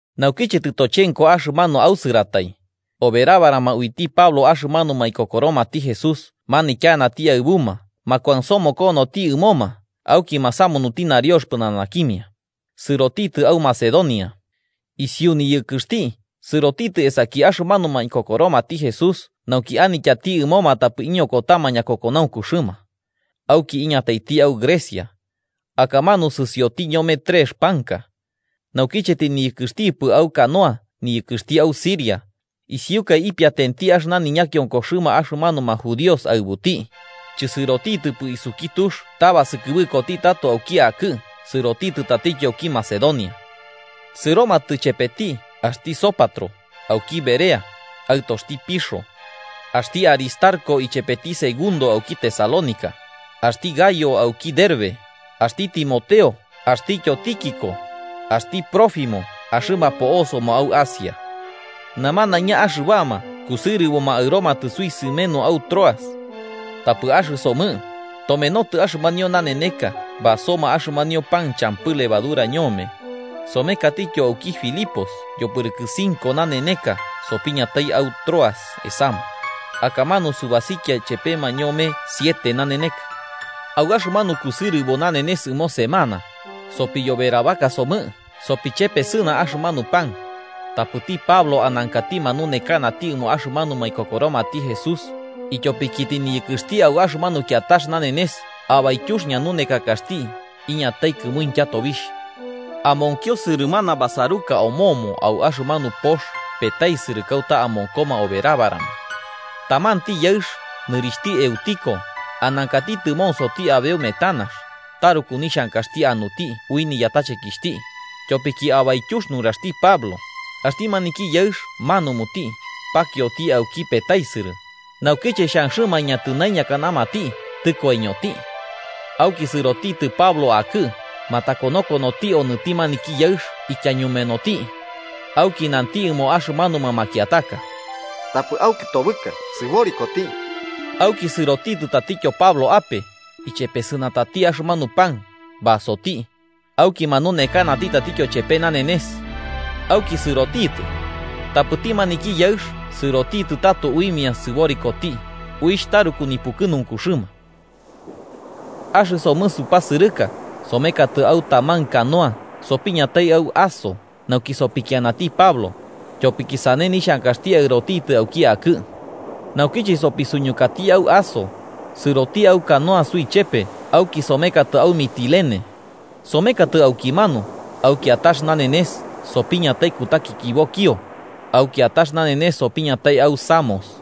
Naukiche tɨtochenko axɨmanu ausɨratai, oberabarama uiti Pablo axɨmanuma ikokoromati Jesús manityanati aɨbuma makuansomokonoti ɨmoma auki masamunuti nariox pɨnanakimia, sɨrotitɨ au Macedonia. Isiu niyɨkɨxti sɨrotitɨ esaki axɨmanuma ikokoromati Jesús nauki anityati ɨmoma tapɨ iñokotama ñakokonaunkuxɨma. Auki iñataiti au Grecia. Akamanu sɨsioti ñome trex panka. Naukiche tɨniyɨkɨxtipɨ au canoa niyɨkɨxti au Siria, isiukaɨ ipiatenti axɨna niñakiokoxɨma axɨmanuma judíos aɨbuti. Chɨsɨrotitɨpɨ isuki tux ta basɨkɨbɨkoti tato auki akɨ sɨrotitɨ tatityo auki Macedonia. Sɨromatɨ chepeti axti Sópatro auki Berea, aɨtoxti Pirro. Axti Aristarco ichepeti Segundo auki Tesalónica, axti Gayo auki Derbe, axti Timoteo axtityo Tíquico, axti Trófimo axɨma po'osoma au Asia. Namanaiña axɨbama kusɨrɨboma aɨromatɨ suisɨmenu au Troas. Tapɨ axɨsomɨ, tomenotɨ axɨmanio naneneka basoma axɨmanio pan champɨ levadura ñome, somekatityo auki Filipos yopɨrɨkɨ cinco naneneka sopiñatai au Troas esama, akamanu subasikia chepema ñome siete naneneka. Au axɨmanu kusɨrɨbo nanenes ɨmo semana, sopiyoberabaka somɨ sopichesɨna axɨmanu pan, tapɨti Pablo anankati manunekanati ɨmoma axɨmanuma ikokoromati Jesús, ityopiki tɨniyɨkɨxti au axɨmanu kiatax nanenes abaityux ñanunekakaxti iñatai kɨmuintya tobixh. Amonkio sɨrɨmana basaruka omomo au axɨmanu pox petaisɨrɨ kauta amonkoma oberabarama. Tamanti yaɨx, nɨrixhti Eutico anankati tɨmonsoti abeu metanax, taruku nixhankaxti anuti ui niyatachekixhti, tyopiki abaityux nuraxti Pablo, axti maniki yaɨx manumuti, pakioti auki petaisɨrɨ, naukiche xhanxɨma aiñatɨnaiñakanamati tɨkoiñoti. Auki sɨrotitɨ Pablo akɨ, matakonokonoti onɨti maniki yaɨx ityañumenoti. Auki nanti ɨmoma axɨmanuma makiataka: –Tapɨ aukɨtobɨka. Sɨborikoti. Auki sɨrotitɨ tatityo Pablo ape, ichepesɨnatati axɨmanu pan basoti, auki manunekanati tatityo chepe nanenes. Auki sɨrotitɨ. Tapɨti maniki yaɨx sɨrotitɨ tato uimia sɨborikoti, uixh taruku nipukɨnunkuxɨma. Axɨsomɨ supasɨrɨka somekatɨ au taman canoa sopiñatai au Aso nauki sopikianati Pablo, tyopiki sane nixhankaxti aɨrotitɨ auki akɨ. Nauche sopisuñukati au Aso, sɨroti au canoa suichepe auki somekatɨ au Mitilene. Somekatɨ aukimanu, au kiatax nanenes sopiñatai kutakikibo Quío, au kiatax nanenes sopiñatai au Samos.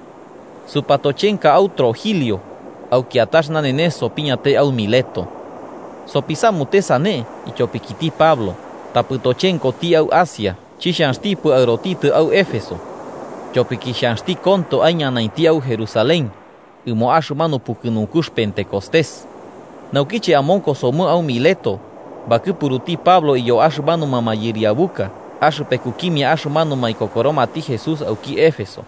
Supatochenka au Trogilio, au kiatax nanenes sopiñatai au Mileto. Sopisamute sane ityopikiti Pablo, tapɨ tochenkoti au Asia, chixhanxtipɨ aɨrotitɨ au Éfeso. Tyopiki xhanxti konto aiñanainti au Jerusalén ɨmo axɨmanu pukɨnunkux Pentecostés. Naukiche amonkosomɨ au Mileto, bakɨpuruti Pablo iyo axɨmanuma mayɨriabuka axɨpekukimia axɨmanuma ikokoromati Jesús auki Éfeso.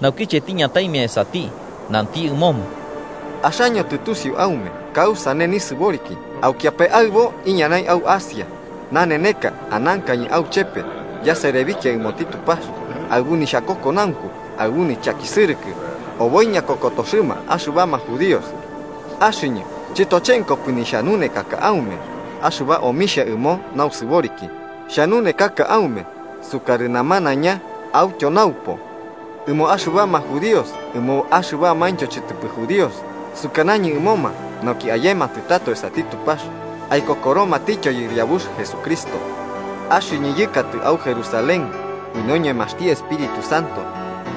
Naukiche tiñataimia esati nanti ɨmoma: “Axaño tɨtusiu aume kausane nisɨboriki aukiapae aɨbo iñanai au Asia. Naneneka anankañɨ auchepe yaserebikia ɨmoti Tupax aɨbu nixhakokonaunku, aɨbu nichakisɨrɨkɨ oboi ñakokotoxɨma axɨbama judíos. Axɨñɨ chɨtochenkopɨ nixhanunekaka aume, axɨba omixha ɨmo nausɨboriki, xhanunekaka aume sukarɨ namanaiña autyo naupo. Ɨmo axɨbama judíos ɨmo axɨbamaintyo chɨtɨpɨ judíos sukanañɨ ɨmoma nauki ayematɨ tato esati Tupax, aikokoromatityo Yɨriabux Jesucristo. Axɨñɨ yɨkatɨ au Jerusalén ui noñemaxti Espíritu Santo,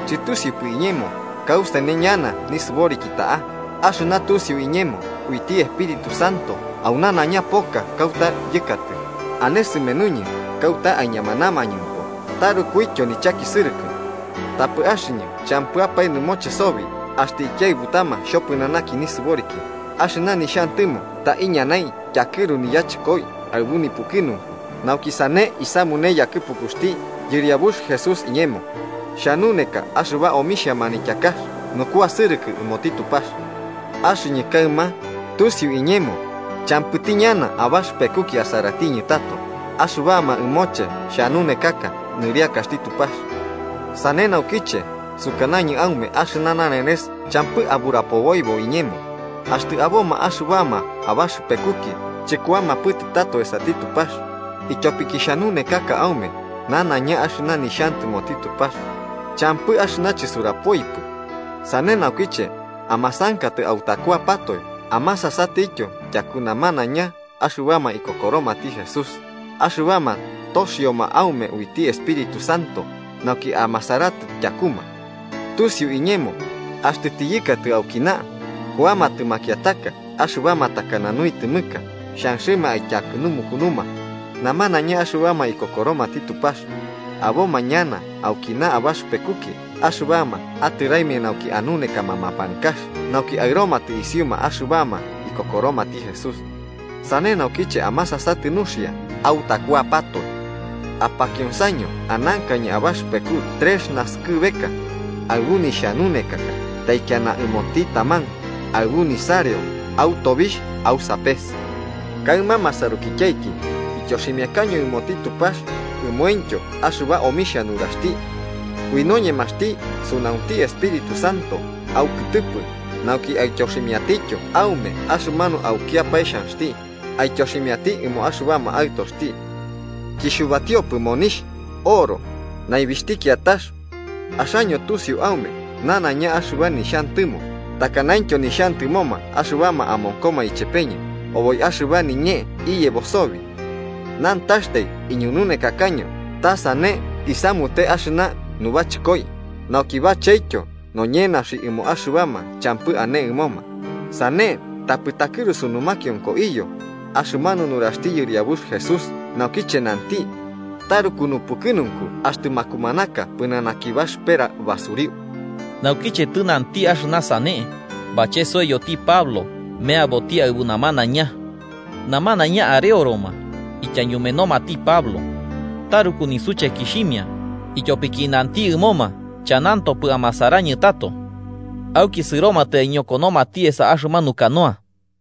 chɨtusiupɨ iñemo kausane ñana nisɨboriki ta'a, axɨna tusiu iñemo uiti Espíritu Santo au nanaiña poka kauta yɨkatɨ, ane sɨmenuñɨ kauta aiñamanamañɨmpo tarukuityo nichakisɨrɨkɨ. Tapɨ axɨñɨ champɨapae nɨmoche sobi axtɨ ikiaɨbutama xhopɨnanakiñɨ nisɨboriki, axɨna nixhantɨmo ta iñanai tyakɨru niyachɨkoi aɨbu nipukɨnunku nauki sane isamune yakɨpukuxti Yɨriabux Jesús iñemo xhanuneka axɨba omixhia manityakax nukuasɨrɨkɨ ɨmoti Tupax. “Axɨñɨ kaɨma tusiu iñemo champɨti ñana abaxɨpekuki asaratiñɨ tato, axɨbama ɨmoche xhanunekaka nɨriakaxti Tupax. Sane naukiche sukanañɨ aume axɨna nanenes champɨ aburapoboibo iñemo, axtɨ aboma axɨbama abaxɨpekuki chɨkuamapɨtɨ tato esati Tupax, ityopiki xhanunekaka aume nanaiña axɨna nixhantɨmoti Tupax, champɨ axɨna chisurapoipɨ. Sane naukiche, amasankatɨ autakuapatoe amasasatɨtyo tyaku namanaiña axɨbama ikokoromati Jesús, axɨbama toxioma aume uiti Espíritu Santo nauki amasaratɨ tyakuma. Tusiu iñemo, axtɨ tiyɨkatɨ aukina, kuamatɨ makiataka, axɨbama takana nuitɨmɨka xhanxɨma aityakɨnumukunuma namanaiña axɨbama ikokoromati Tupax. Aboma ñana aukina abaxɨpekuki axɨbama atɨraimia nauki anunekama mapankax nauki aɨromatɨ isiuma axɨbama ikokoromati Jesús. Sane naukiche amasasatɨ nuxia autakuapatoe. Apakionsaño anankañɨ abaxɨpeku trex naskɨbeka, aɨbu nixhanunekaka taikiana ɨmoti taman aɨbu nisareo au tobixh au sapes. “Kaɨma masarukityaiki ityoximiakaño ɨmoti Tupax, ɨmointyo axɨba omixha nuraxti. Ui noñemaxti sunaunti Espíritu Santo aukɨtɨpɨ nauki aityoximiatityo aume axɨmanu aukiapae xhanxti aityoximiati ɨmo axɨbama aɨtoxti. Chixhubatiopɨ monixh, oro, naibixhti kiatax. Axaño tusiu aume, nanaiña axɨba nixhantɨmo takanaintyo nixhantɨmoma axɨbama amonkoma ichepeñɨ, oboi axɨba niñee iyebo sobi. Nantaxtai iñununekakaño ta sane uisamute axɨna nubachɨkoi, nauki bachetyo noñenaxi ɨmo axɨbama champɨ ane ɨmoma, sane tapɨ takɨrusu numakionko iyo axɨmanu nuraxti Yɨriabux Jesús, naukiche nanti: ‘Taruku nupukɨnunku axtɨ makumanaka, pɨnanaki baxɨpera basuriu.’ Naukiche tɨnanti axɨna sane, bachesoiyoti Pablo meaboti aɨbu namanaiña. Namanaiña areoroma, ityañumenomati Pablo. Taruku nisuchekixhimia, ityopiki nanti ɨmoma chanantopɨ amasarañɨ tato. Auki sɨromatɨ aiñokonomati esa axɨmanu canoa.